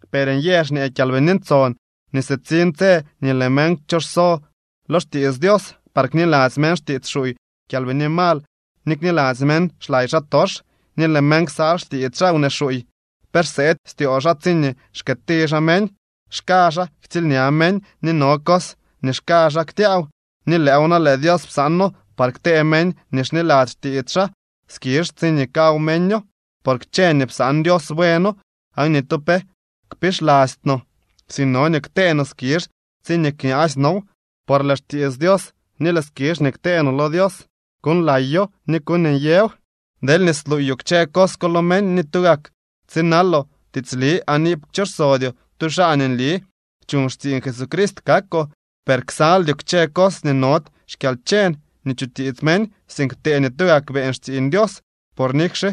Per nyë xñee Kyalbini Ntson nii sitsiñ tse nii lëë meñ kchoxso lo xtiits Dios, par kniladzy meñ xtiits xuuy kyalbini mal ni kniladzy meñ xlay xaatox. Ni lëë meñ ksal xtiits xaa wnee xuuy, pe xseedy styoo xaa tsiñee xkëëti xaa meñ. Xka xaa ktsiilña meñ ni no cos nii xka xaa ktyaaw, ni lëëw na lëë Dios psaano par ktee meñ nii xniladzy xtiits xaa skizh tsiñee kaw meño. Por kchë nii psaan Dios bueno. Aan ni tu pe kpixlasty no, sink no nii ktee no skizh tsiñee kñaasy now, por lëë xtiits Dios ni lëë skizh nii ktee no lo Dios kuuñlayo ni kuuñnyëw. Deelñee sluuyoo kchë cos ko lo meñ ni tugak tsinaloo tiitsli aan iip kchoxsodyoo, tu xaa nii nli chuñ xtsiiñ Jesucrist kakoo. Per ksaldyoo kchë cos nii nody xkyalcheñ nii chutiits meñ. Sink ptee nii tugak beeñ xtsiiñ Dios. Por nikxe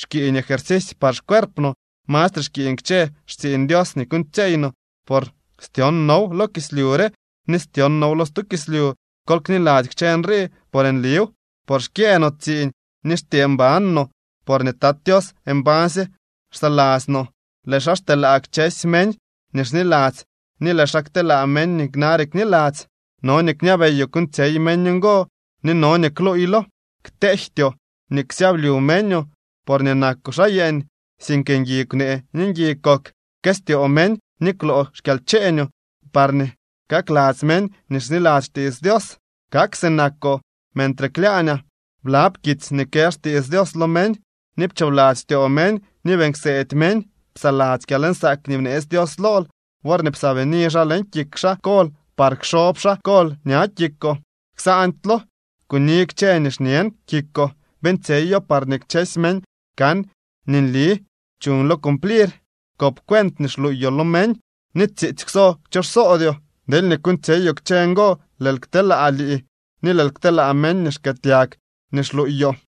xkiiñ ejercisy par xcuerp no, mastre xkiiñ kchë xtsiiñ Dios nii kuuñtsyeey no, por styon now lo kislyu re ni styon now lo stu kislyu. Kol kniladzy kchë nrii, por nliw. Por xkyëë no tsiiñ ni xtyee mban no, porñee Tat Tios mbañsye xsaladzy no. Lëë xaa xteelaa kchësy meñ nii xniladzy ni lëë xaa kteelaa meñ nii nare kniladzy. No nii kñabeyoo kuuñtsyey meñ ngo ni no nii kluuylo. Kteejtyoo nii ksyablyu meñoo porñee nakoo xaa yeeñ, sink ngui kwnee ni ngui kok, pkëstyoo meñ ni kwloo xkyalcheeñoo, parñee kakladzy meñ nii xniladzy xtiits Dios kak sinakoo. Mentre klyaañaa, blab kitsy nii kë xtiits Dios lo meñ, ni pchoobladzy styoo meñ ni beeñ kseedy meñ. Psaladzy kyalnsaak nii bneetsy Dios lool worñee psaabini xaa leñ kik xaa kol par kxob xaa kol ña kikoo. Ksaandylo. Kuni kchë nii xñen kikoo, beeñtsyeyoo, parñee kchësy meñ kan nii nli chuñlo cumplir. Kop cuent nii xluuyoo lo meñ, ni tsiitsy kwso kchoxsodyoo. Deelñee kuuñtsyeyoo kchë ngo lëël kteelaa lii ni lëël kteelaa meñ nii xkëëtyag nii xluuyoo.